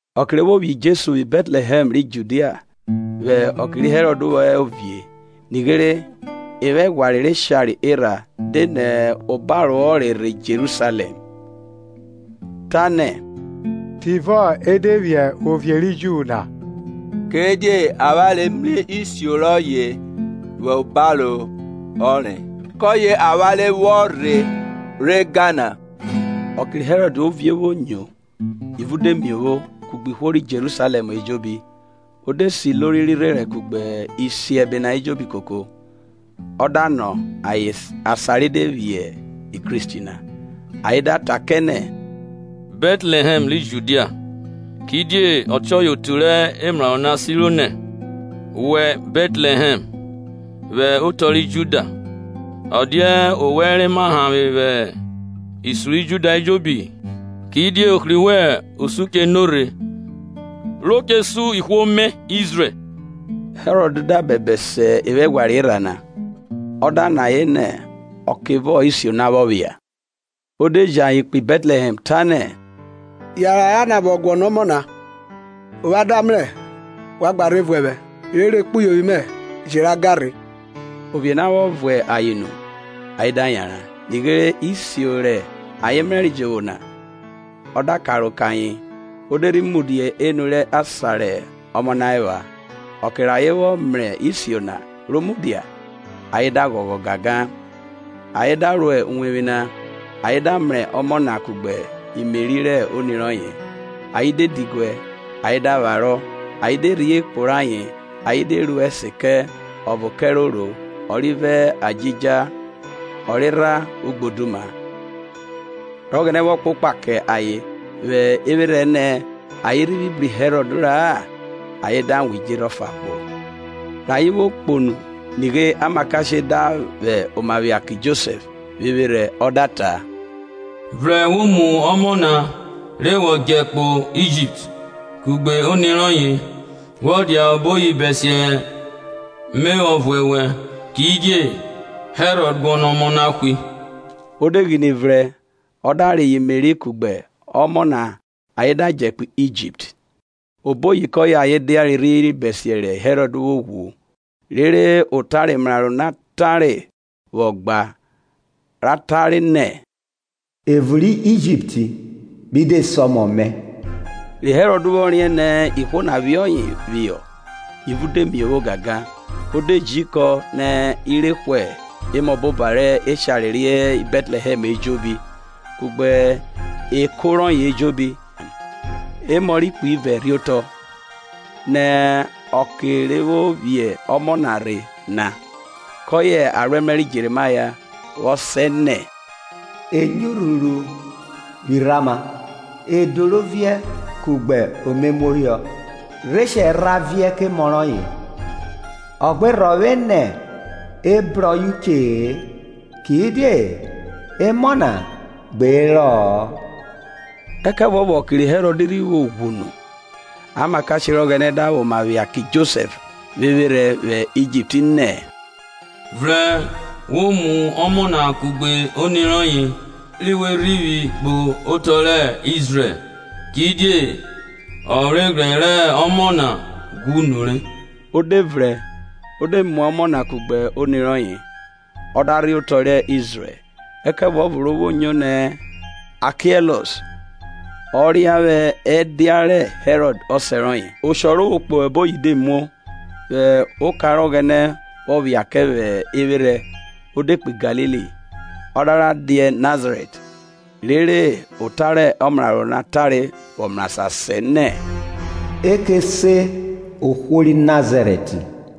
Ọke re vwo vwiẹ Jesu vwi Bẹtlẹhẹm ri Judia vwẹ ọke ri Herọd vwọ hẹ ovie, nighere, evwaghwanre rẹ eshare erha de nẹ obaro ọnre rhe Jerusalẹm, tanẹ, Tivọ e de vwiẹ ovie ri Ju na? Kidie avwanre mrẹ isio rọye vwẹ obaro ọnre, kọye avwanre vwọ rhe re ga na. Ọke ri Herọd ovie vwo nyo, ivun de miovwo, kugbe ihwo ri Jerusalẹm ejobi O de se ilori rẹ irherẹn kugbe isiẹbe na ejobi koko, ọ da nọ ayen asan re de vwiẹ Kristi na. Ayen da ta kẹ nẹ, Bẹtlẹhẹm ri Judia; kidie ọtiọye otu rẹ emraro na siro nẹ; Wẹ Bẹtlẹhẹm, vwẹ otọ ri Juda Ọ dia owẹ re ma hanvwe vwẹ isun ri Juda ejobi; Kidie ohri wẹn osun che nurhe ro che sun ihwo mẹ Izrẹl. Herọd da bẹbẹ se evwaghwanre erha na, ọ da nọ ayen nẹ ọkevọ isio na vwọ phia; Ọ de ji ayen kpo Bẹtlẹhẹm, tanẹ, Yanran ra nabọ guọnọ ọmọ na, ovwan da mrẹ wa gba rhe vuẹ vwẹ, rere okpuyovwi mẹ je ra ga rhe. Ovie na vwọ vuẹ ayen nu, ayen da yanran; nighe isio rẹ ayen mrẹre jovwo na, ọ da karo kẹ ayen, o de rhi mudia enu rẹ asan rẹ ọmọ na epha. Ọke rẹ ayen vwọ mrẹ isio na ro mudia, ayen da ghọghọ gangan. Ayen da ro uwevwi na, ayen da mrẹ ọmọ na kugbe Meri rẹ oni rọye, ayen de diguẹ ayen da vwarọ, ayen de rhie ekpo rayen, ayen de ru ẹse kẹ, ọvo kẹrẹ oro, ọrivẹ adjija ọrerha ugboduma. Rẹ Ọghẹnẹ vwọ kpokpa kẹ ayen vwẹ evwerhẹ nẹ ayen rhivwi bru Herọd ra-a, ayen da wan idjerhe ọfa kpo. Rẹ ayen vwo kpo nu nighe amakashe da vwẹ oma phia kẹ Josẹf vwẹ evwerhẹ ọ da ta, Vrẹn wo mu ọmọ na re wọ djẹ kpo Ijipt, kugbe oni rọye, wọ dia oboyi bẹsiẹ me vwọ vuẹ ovuẹ rhe wẹ, kidie Herọd guọnọ ọmọ na hwe. O de ghine vrẹn ọ da reyọ Meri kugbe ọmọ na ayen da djẹ kpo Ijipt. Oboyi kọye ayen diare rhiri bẹsiẹ ri Hẹrọd vwo ghwu; rere ota rẹ omrarọ na tare vwọ gba, ra tare nẹ, Evun rẹ Ijipt mi de se ọmọ mẹ. Ri Herọd vwọ riẹn nẹ ihwo na phiẹ ọye phihọ, ivun de miovwo gangan, o de ji ikọn nẹ e rẹ hwe emọboba rẹ eshare re hẹ Bẹtlẹhẹm ejobi, kugbe eko rọye ejobi, emọ rẹ ikpe ive rhe otọ, nẹ okẹ re vwo vwiẹ ọmọ na rhe na. Kọye aroẹmrẹ ri Jerimaya vwọ sẹ nẹ, Enyo urhuru vwi Rama, Edo rẹ oviẹ kugbe omemuohọ, Reshẹl ra viẹ kẹ emọ rọye; O gbe rhọvwe nẹ e bru ọye uche-e, kidie emọ na gbe herọ-ọ. Ẹkẹvuọvo ọke ri Herọd rhi vwo ghwu nu, amakashe rẹ Ọghẹnẹ da vwẹ oma phia kẹ Josẹf vwẹ evwerhẹ vwẹ Ijipt nẹ, Vrẹn wo mu ọmọ na kugbe oni rọye, ri we rhivwi kpo otọ rẹ Izrẹl, kidie ọvweghrẹ rẹ ọmọ na ghwu nure. O de vrẹn o de mu ọmọ na kugbe oni rọye, ọ da rhe otọ rẹ Izrẹl. Ẹkẹvuọvo ro vwo nyo nẹ Akiẹlus ọ ria vwẹ ẹdia ri Herọd ọsẹ rọye, osho ro vwo kpo oboyi de muo; vwẹ oka rẹ Ọghẹnẹ vwọ phia kẹ vwẹ evwerhẹ, o de kpo Galili. Ọ da ra dia Nazarẹt, rere ota rẹ ọmraro na tare vwọ mrasan sẹ nẹ, e che se ohwo ri Nazarẹt.